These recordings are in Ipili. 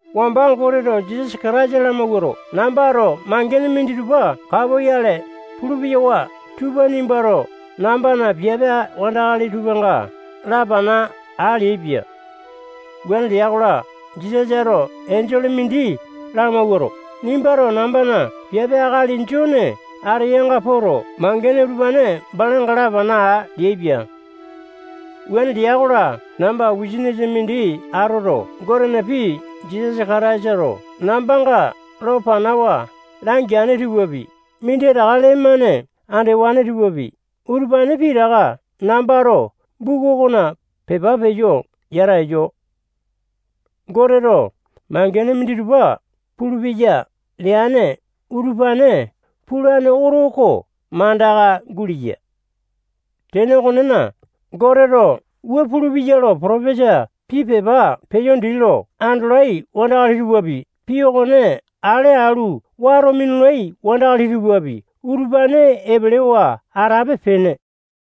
Wamba Goteto Jisasa Kataisa lamawuato, nambato mangene minditupa kapoyale pulu-peyawa tupa nimbato nambana piape wandakali tupanga lapana aa leaipia. Wuane lea-kola, Jisasato enjole mindi lamawuato, nimbato nambana piape akali Jone ateyanga poto, mangene utupane balanga lapana aa leaipia. Wuane lea-kola, namba wisanisa mindi atoto, Gotena pii Jisasa Kataisato nambanga lo panawa langeane tupapi, minditaka lee-mane andewane tupapi, utupane pitaka nambato buku okona pepa peyo yata eyo. Goteto mangene minditupa pulupeya leane utupane pulane oto oko mandaka guleya. Tene okonena, Goteto wua pulupeya lo potopesa pii pepa peleyo dii lo andolai wandakali tupapi, pii okone ale alu, wato minulai wandakali tupapi, utupane epelewa atape-pene.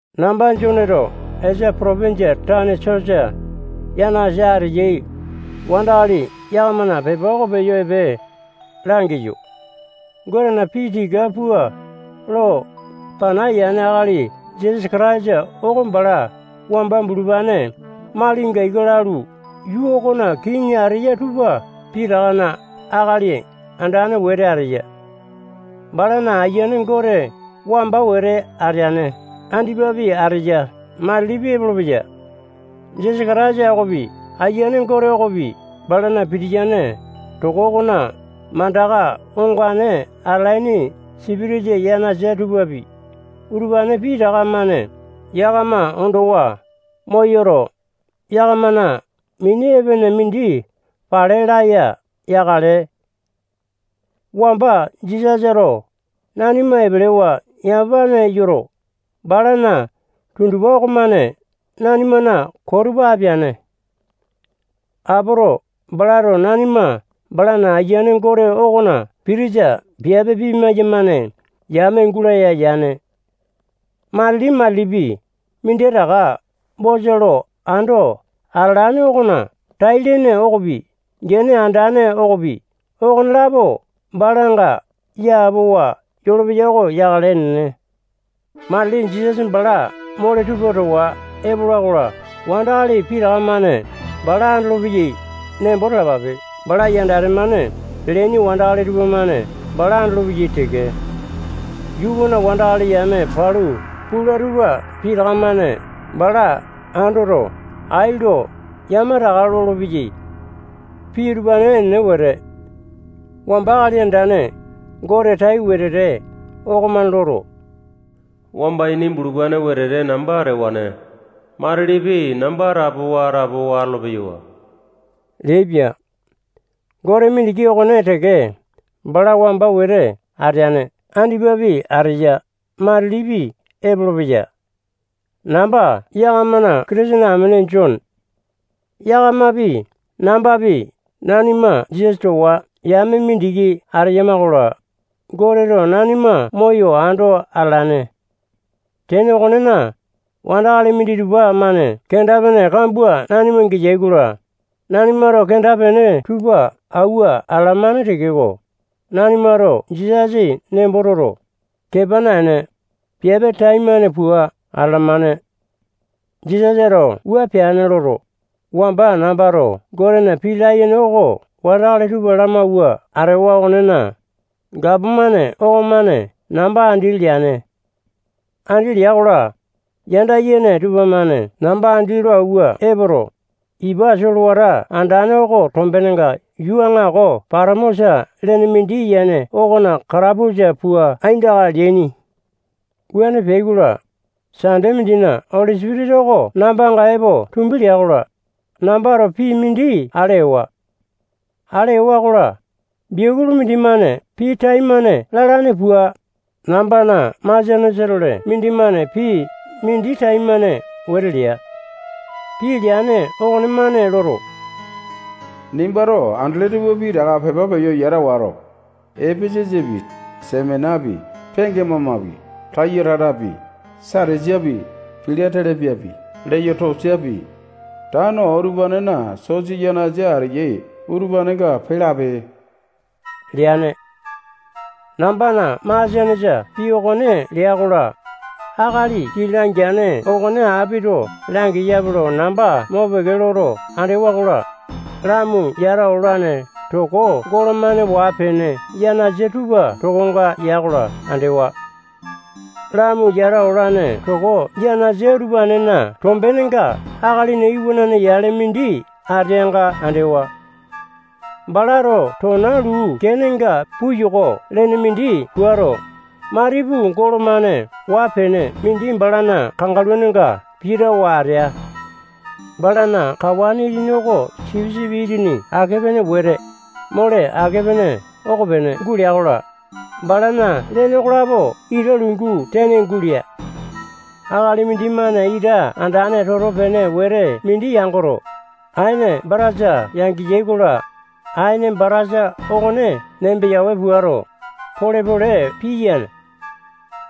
Namba Joneto Esia potopinjia tane sosa yanasa ateyai wandakali yakamana pepa oko peyo epe langeyo. Gotena pii tika pua lo pana yane akali Jisasa Kataisa oko bala wamba bulupane malinga ika lalu, yuu okona kiŋi ateyai tupa pitakana Akali Andane wete ateya. Balana Ayiane Gote wamba wete ateane, andipapi ateya, matilipi epolopeya. Jisasa Kataisa okopi, Ayiane Gote okopi, balana pitiyane toko okona mandaka ongane atalaini sipitisa yanasa tupapi, utupane pitaka-mane yakama ondowa moyoto, yakamana mini epene mindi pale laya yakale. Wamba Jisasato nanima epelewa yamapane yoto, balana tundupa okomane nanimana koo tupa apeane. Apoto, balato nanima balana Ayiane Gote okona pitisa piape pimayamane yame gulaya yane. Matili-matilipi minditaka bosa lo ando atalane okona tai-lene okopi, gene andane okopi, okonelapo balanga yapowa yolopeya oko yakale. Enene. Matili Jisasa bala mole tupa towa epola-kola, wandakali pitaka-mane bala andolopeyai nembo talapape. Bala yandate-mane peleaini wandakali tupamane bala andolopeyai teke. Yuu okona wandakali yame palu pula tupa pitaka-mane bala andoto, ai lo yamataka lolopeyai. Pii utupane enene wete. Wamba Akali Andane Gote tai wetete okomane loto, wamba ini bulupane wetete namba atewane. Matilipi, namba atapowa-atapowa atolo-peyawa leaipia. Gote mindiki okone teke bala wamba wete ateane, andipapi ateya, matilipi epolopeya. Namba yakamana Kitisene amene Jone. Yakamapi, nambapi, nanima Jisasa towa yame mindiki ateyama-kola, Goteto nanima moyo ando atalane. Tene okonena, wandakali minditupa-mane kenda-pene kambua nanima geyai-kola, nanimato kenda-pene tupa auwa atalamane tekeko, nanimato Jisasa nembo toto, kepa naene, piape taimane pua atalamane. Jisasato wua peane loto, wamba nambato Gotena pii layene oko wandakali tupa lamauwa atewa okonena, gapomane okomane namba andi leane. Andi lea-kola, yanda yene tupamane namba andi lo auwa epoto, ipa solewata andane oko tombenga yuu aŋako Patamosa lene mindi yene okona katapusa pua aindaka leaini. Wuane peai-kola, Sande mindina Oli Sipitisa oko nambanga epo tumbi lea-kola, nambato pii mindi ale ewa. Ale ewa-kola, biakulu mindimane pii taimane lalane pua, nambana masianesa-tole mindimane pii mindi taimane wete lea. Pii leane okonemane loto, nimbato andele tupa pitaka pepa peyo yata wato, Epesesapi, Semenapi, Pekemamapi, Taya-taitapi, Satisapi, Pila-telepiapi, Leyoto-siapi, tano utupanena sosa yanasa ateyai utupanenga pee lape leane. Nambana masianesa pii okone lea-kola, akali pii langeane okone apito langeyape lo namba mopeke loto andewa-kola, lamu yata olane toko golo-mane waa-pene yanasa tupa tokonga ya-kola andewa. Lamu yata olane toko yanasa utupanena tombenenga Akalina Iwanane yale mindi ateanga andewa. Balato tona luu kenenga puyoko lene mindi puato, matipu golo-mane waa-pene mindi balana kangaluninga pitawa atea. Balana kawa itini oko sipisipi itini ake-pene wete, mole ake-pene okopene gulea-kola, balana lene okolapo ita lungu tene gulea. Akali mindimane ita andane toto-pene wete mindi yangoto, aene batasa yangeyai-kola, aene batasa okone nembeyawe puato, pole-pole piyane.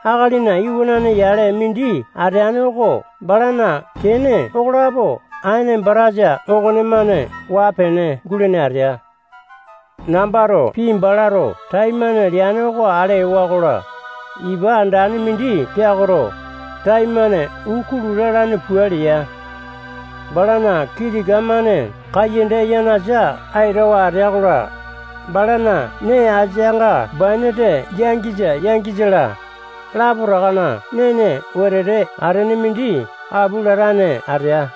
Akalina Iwanane yale mindi ateane oko balana kene okolapo aene batasa okonemane waa-pene gulene atea. Nambato pii balato taimane leane oko ale ewa-kola, ipa andane mindi peakoto, taimane uu kulu lalane pua lea. Balana kii tika-mane kaiyanda yanasa aitawa atea-kola, balana nee asianga bainate yangisa, yangisa-la, lapotakana nene wetete atene mindi apu latane atea.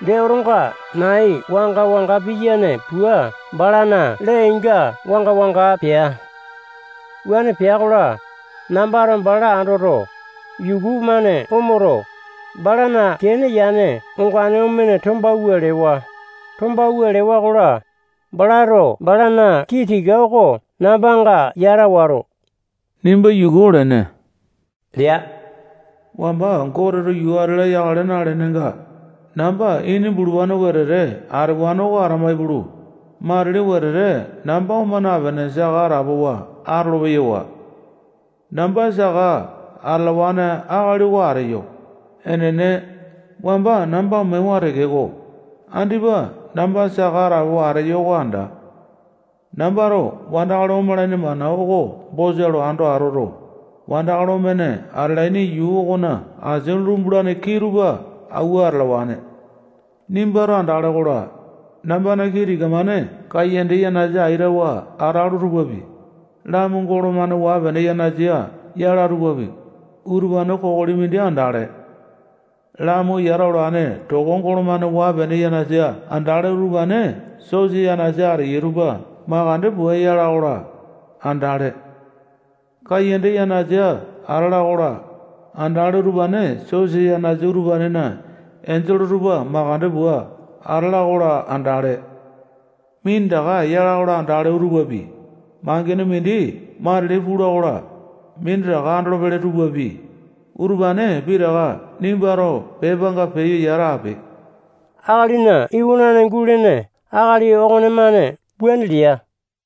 Dee, otonga nai wanga-wanga piyane pua balana lee-inga wanga-wanga pea. Wuane pea-kola, nambato bala andoto, yuku-mane omoto, balana kene yane ongane omene tombawua lewa. Tombawua lewa-kola, balato balana kii tika oko nambanga yata wato, nimba yuku olene lea. Wamba Goteto yuu ati-la yakale nalenenga, namba ini bulupane wetete atewane oko atama ipulu, matili wetete namba oma napene, saka atapowa atolo-peyawa. Namba saka atalawane akali oko ateyo. Enene, wamba namba omewa tekeko, andipa namba saka atapowa ateyo oko anda. Nambato wandakali omalaini mana oko bosa lo ando atoto, wandakali omene atalaini yuu okona asia lumbulane kii tupa awua atalawane. Nimbato andale-kola, nambana kii tika-mane kaiyanda yanasa aitawa atalo tupapi, lamu golo-mane waa-pene yanasa yala tupapi, utupane kokoli mindi andale. Lamu yata olane toko golo-mane waa-pene yanasa andale utupane sosa yanasa ateyai tupa makande pua yala-kola, andale. Kaiyanda yanasa atala-kola, andale utupane sosa yanasa utupanena enjole tupa makande pua atala-kola, andale. Minditaka ya-kola andale utupapi, mangene mindi matili pula-kola, minditaka andolopele tupapi, utupane pitaka nimbato pepanga peyo yata ape. Akalina Iwanane gulene akali okonemane wuane lea.